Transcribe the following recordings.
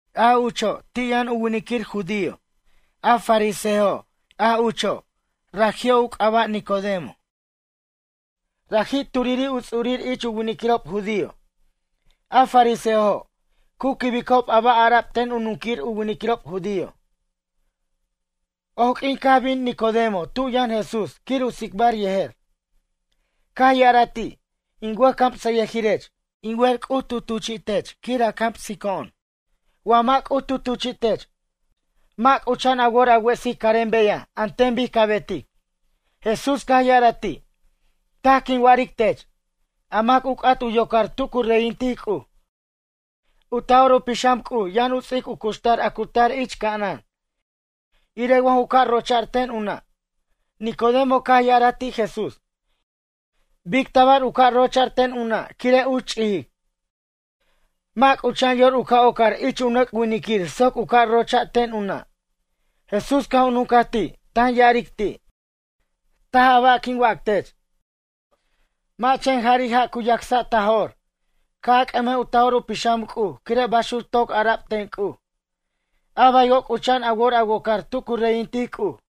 A ucho' ti' yʌn u winiquir judío a fariseojo' a ucho', raji'o' u c'aba' Nicodemo. Raji' turiri' u ts'urir ich u winiquirob judío. A fariseojo' cu quibicob a ba' ara'b ten u nunquir u winiquirob judío. Oq'uin caj bin Nicodemo tu yʌn Jesús quir u tsicbar yejer. Caj ya'araj ti': ―In wʌjcamsʌyʌjirech. In wer C'uj tu tuchi'tech quir a camsico'on. Wa mʌ' C'uj tu tuchi'tech, mʌ' c'ucha'an a wor a wesic carem beyaj an ten bic ca betic. Jesús caj ya'araj ti': ―Taj quin wa'aric tech. A mac u c'at u yocar tu cu reyintic C'uj, u Taj'or u Pixam C'uj yʌn u ts'ic u cuxtar a cu tar ich ca'anan. Irej wa ju ca' rocha'r ten u nʌ'. Nicodemo caj ya'araj ti' Jesús: ―Bic tabar u ca' rochar ten u nʌ' quire' uch ch'ijic? Mʌ' c'ucha'an yor u ca' ocar ich u nʌc' winic soc u ca' rocha' ten u nʌ'. Jesús caj u nuncaj ti', tan ya'aric ti': ―Taj a ba' quin wac tech. Mʌ' chen jari' ja' cu yacsa' ta jo'r, ca' a c'ʌmej u Taj'or u Pixam C'uj quire' baxuc toc ara'b ten C'uj. A baywo' c'ucha'an a wor a wocar tu cu reyintic C'uj.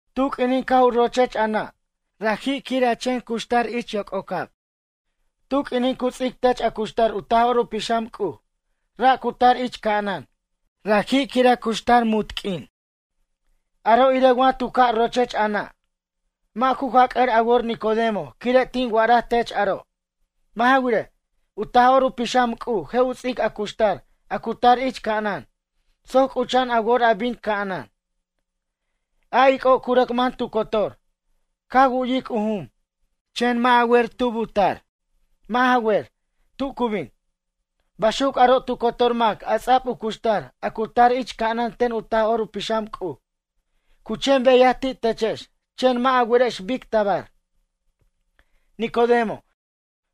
Tu q'uinin caj u rochech a nʌ', raji' quir a chen cuxtar ich yoc'ocab. Tu q'uinin cu ts'ic tech a cuxtar u Taj'or u Pixam C'uj, ra' cu tar ich ca'anan, raji' quir a cuxtar munt q'uin. Aro' irej wa tu ca' rochech a nʌ'. Mʌ' ju jac'ʌr a wor Nicodemo quire' tin wa'araj tech aro'. Mʌ' ja wirej, u Taj'or u Pixam C'uj je' u ts'ic a cuxtar a cu tar ich ca'anan soc c'ucha'an a wor a bin ca'anan. A ic'o' cu rʌc man tu cotor. Ca wu'yic u jum, chen mʌ' a wer tub u tar, mʌ' ja wer, tu cu bin. Baxuc aro' tu cotor mac a ts'ab u cuxtar a cu tar ich ca'anan ten u Taj'or u Pixam C'uj. Cu chen beyaj ti' techex chen mʌ' a werex bic tabar. Nicodemo,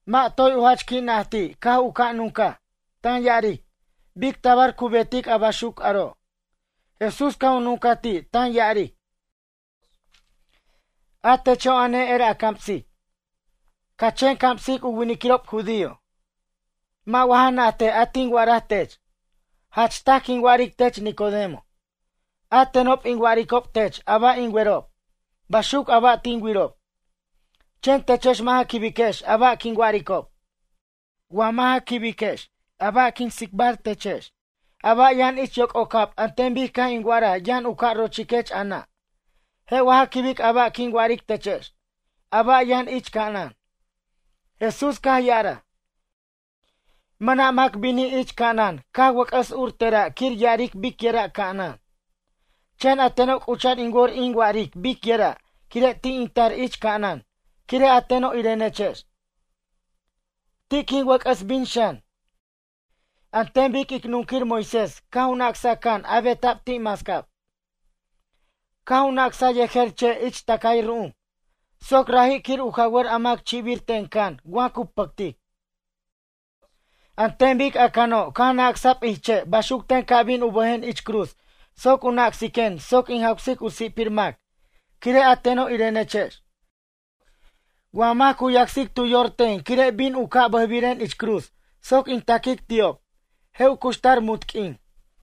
mʌ' toy u jach qui' najti' caj u ca' nuncaj, tan ya'aric: ―Bic tabar cu betic a baxuc aro'? Jesús caj a nuncaj ti' tan ya'aric: ―A techo' a ne'er a camsic, ca chen camsic u winiquirob judío. Mʌ' wa ja najtej a tin wa'araj tech? Jach taj quin wa'aric tech Nicodemo. A tenob in wa'aricob tech a ba' in werob, baxuc a ba' tin wirob. Chen techex mʌ' ja quibex a ba' quin wa'aricob. Wa mʌ' ja quibiquex a ba' quin tsicbar techex, a ba' yʌn ich yoc'ocab an ten bic caj in wa'araj yʌn u ca' rochiquech a nʌ'. Je' wa ja quibic a ba' quin wa'aric techex, a ba' yʌn ich ca'anan? Jesús caj ya'araj: ―Mʌna' mac binij ich ca'anan caj wʌc'ʌs ur tera' quir ya'aric bicyʌra' ca'anan. Chen a teno' c'ucha'an in wor in wa'aric bicyʌra' quire' ti' in tar ich ca'anan quire' a teno' irenechex. Ti' quin wʌc'ʌs bin xan. An ten bic ic nunquir Moisés caj u nacsaj can a beta'b ti' mascab, caj u nacsa yejer che' ich tacay ru'um. Soc raji' quir u jawʌr a mac chi'bir ten can wa cu pʌctic. An ten bic a cano' caj nacsa'b ich che' baxuc ten ca' bin u bʌjen ich cruz soc u nacsiquen soc in jawsic u si'pir mac quire' a teno' irenechex. Wa mac cu yacsic tu yor ten quire' bin u ca' bʌjbiren ich cruz soc in taquic ti'ob, je' u cuxtar munt q'uin.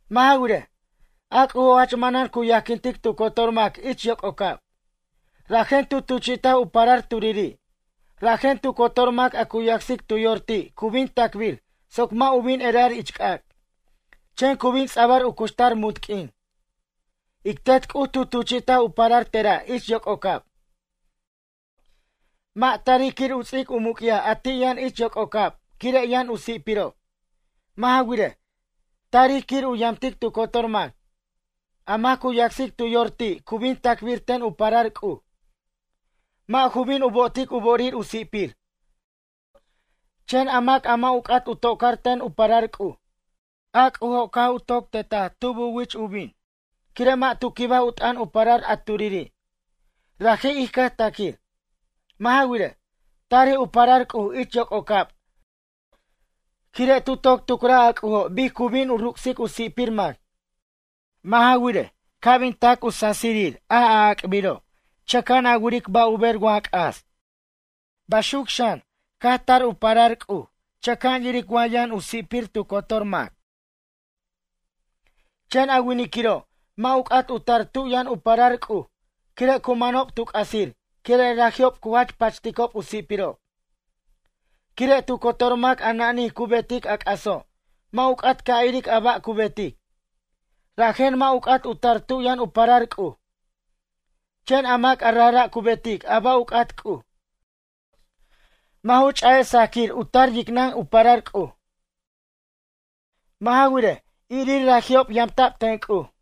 ’Mʌ' ja wirej, a C'ujo' jach manan cu yajquintic tu cotor mac ich yoc'ocab. Rajen tu tuchi'taj u parar turiri'. Rajen tu cotor mac a cu yacsic tu yor ti' cu bin tacbir soc mʌ' u bin erar ich c'ac'. Chen cu bin ts'abʌr u cuxtar munt q'uin. Ic Tet C'uj tu tuchi'taj u parar tera' ich yoc'ocab. Mʌ' tarij quir u ts'ic u muc'yaj a ti' yʌn ich yoc'ocab quire' yʌn u si'pirob. Mʌ' ja wirej, tarij quir u yamtic tu cotor mac. ’A mac cu yacsic tu yor ti' cu bin tacbir ten u parar C'uj, mʌ' ju bin u bo'otic u bo'orir u si'pir. Chen a mac a mʌ' u c'at u to'car ten u parar C'uj. A C'ujo' caj u toc tetaj tub u wich u bin, quire' mʌ' tu quibaj u t'ʌn u parar a turiri', raji' ij cʌj taquir. Mʌ' ja wirej, tarij u parar C'uj ich yoc'ocab quire' tu toc tucraj a C'ujo' bic cu bin u ruc'sic u si'pir mac. Mʌ' ja wirej, ca' bin tac u sasirir a a'ac'biro' chʌca'an a wiric ba' u ber wa c'as. Baxuc xan caj tar u parar C'uj chʌca'an yiric wa yʌn u si'pir tu cotor mac. Chen a winiquiro' mʌ' u c'at u tar tu yʌn u parar C'uj quire' cu manob tu c'asir quire' raji'ob cu jach pachticob u si'pirob. Quire' tu cotor mac a na'nij cu betic a c'aso' mʌ' u c'at ca' iric a ba' cu betic. Rajen mʌ' u c'at u tar tu yʌn u parar C'uj. Chen a mac a rajra' cu betic a ba' u c'at C'uj, mʌ' ju ch'a'ej sajquir u tar yicnʌn u parar C'uj. Mʌ' ja wirej, irir raji'ob yamta'b ten C'uj.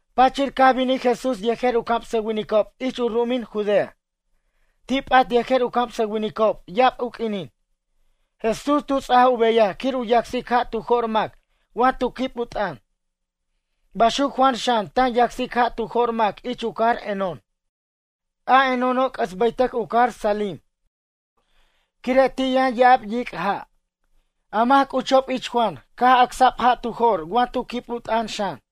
Pachir caj binij Jesús yejer u camsʌwinicob ich u ru'umin Judea. Ti' p'at yejer u camsʌwinicob ya'ab u q'uinin. Jesús tu ts'aj u beyaj quir u yacsic ja' tu jo'r mac wa tu quib u t'ʌn. Baxuc Juan xan tan yacsic ja' tu jo'r mac ich u cajar Enón. A Enóno' c'ʌs bʌytʌc u cajar Salim. Quire' ti' yʌn ya'ab yic' ja'. A mac c'uchob ich Juan caj ac'sa'b ja' tu jo'r wa tu quib u t'ʌn xan.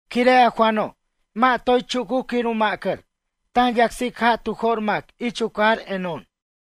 Quire' a Juano', mʌ' toy chucuc quir u ma'cʌr, tan yacsic ja' tu jo'r mac ich u cajar Enón.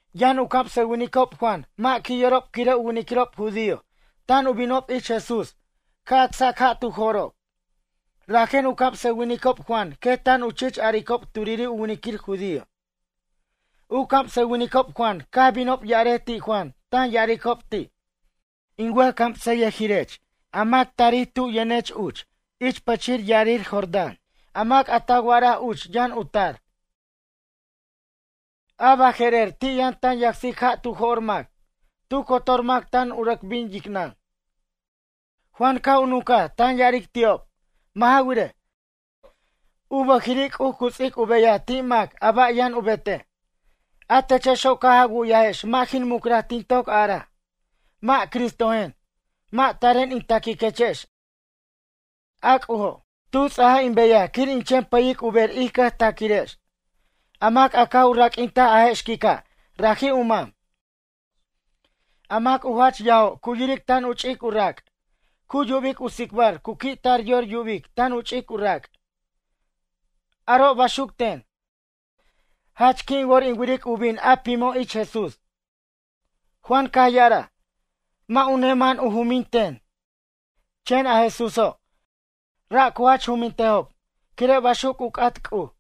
Yʌn u camsʌwinicob Juan mʌ' qui' yorob quire' u winiquirob judío tan u binob ich Jesús ca' acsac ja' tu jo'rob. Rajen u camsʌwinicob Juan quet tan u chich aricob turiri' u winiquir judío. U camsʌwinicob Juan caj binob ya'arej ti' Juan tan ya'aricob ti': ―In wʌjcamsʌyʌjirech a mac tarij tub yʌnech uch ich pʌchir ya'arir Jordán a mac a ta wa'araj uch yʌn u tar. A baje'rer ti' yʌn tan yacsic ja' tu jo'r mac, tu cotor mac tan u rʌc bin yicnʌn. Juan caj u nuncaj tan ya'aric ti'ob: ―Mʌ' ja wirej, u bʌjiri' C'uj cu ts'ic u beyaj ti' mac a ba' yʌn u betej. A techexo' caj a wu'yajex mʌ' jin mucraj tin toc araj: Mʌ' Cristojen. Mʌ' taren in taquechex. A C'ujo', tu ts'aj in beyaj quir in chen pʌyic u ber ij cʌjtaquirex. A mac a caj u raq'uintaj a je' xquica' raji' u mam. A mac u jach yajo' cu yiric tan u ch'ic u rac'. Cu yubic u tsicbar cu qui' tar yor yubic tan u ch'ic u rac'. Aro' baxuc ten, jach qui' in wor in wiric u bin a pimo' ich Jesús. Juan caj ya'araj: ―Mʌ' u neman u jumin ten, chen a Jesúso', ra' cu jach jumintejob, quire' baxuc u c'at C'uj.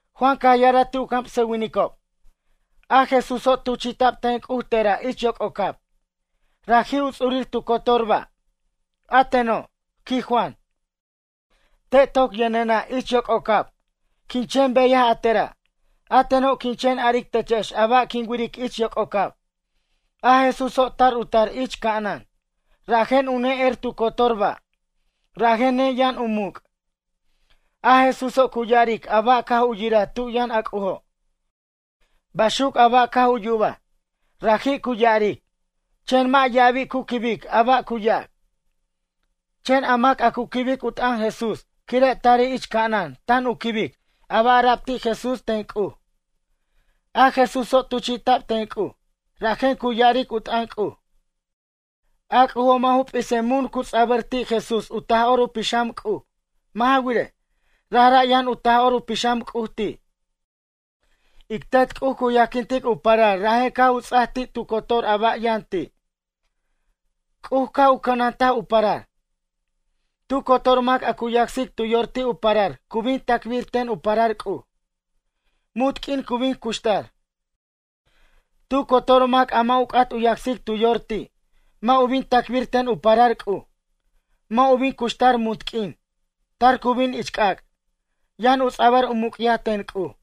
Juan caj ya'araj ti' u camsʌwinicob: ―A Jesúso' tuchi'ta'b ten C'uj tera' ich yoc'ocab, raji' u ts'urir tu cotor ba'. A teno' ―quij Juan―, te' toc yʌnena' ich yoc'ocab, quin chen beyaj a tera'. A teno', quin chen aric techex a ba' quin wiric ich yoc'ocab. A Jesúso' tar u tar ich ca'anan, rajen u ne'er tu cotor ba'. Rajen neyʌn u muc'. A Jesúso' cu ya'aric a ba' caj u yiraj tu yʌn a C'ujo'. Baxuc a ba' caj u yubaj, raji' cu ya'aric. Chen mʌ' ya'abi' cu quibic a ba' cu yac. Chen a mac a cu quibic u t'an Jesús quire' tarij ich ca'anan tan u quibic a ba' ara'b ti' Jesús ten C'uj. A Jesúso' tuchi'ta'b ten C'uj, rajen cu ya'aric u t'ʌn C'uj. A C'ujo' mʌ' ju p'isej mun cu ts'abʌr ti' Jesús u Taj'or u Pixam C'uj. mʌ' ja wirej, rajra' yʌn u Taj'or u Pixam C'uj ti'. Ic Tet C'uj cu yajquintic u parar rajen caj u ts'aj ti' tu cotor a ba' yʌn ti', C'uj ca' u cʌnantej u parar. Tu cotor mac a cu yacsic tu yor ti' u parar cu bin tacbir ten u parar C'uj. Munt q'uin cu bin cuxtar. Tu cotor mac a mʌ' u c'at u yacsic tu yor ti', mʌ' u bin tacbir ten u parar C'uj. Mʌ' u bin cuxtar munt q'uin, tar cu bin ich c'ac'. Yʌn u ts'abʌr u muc'yaj ten C'uj.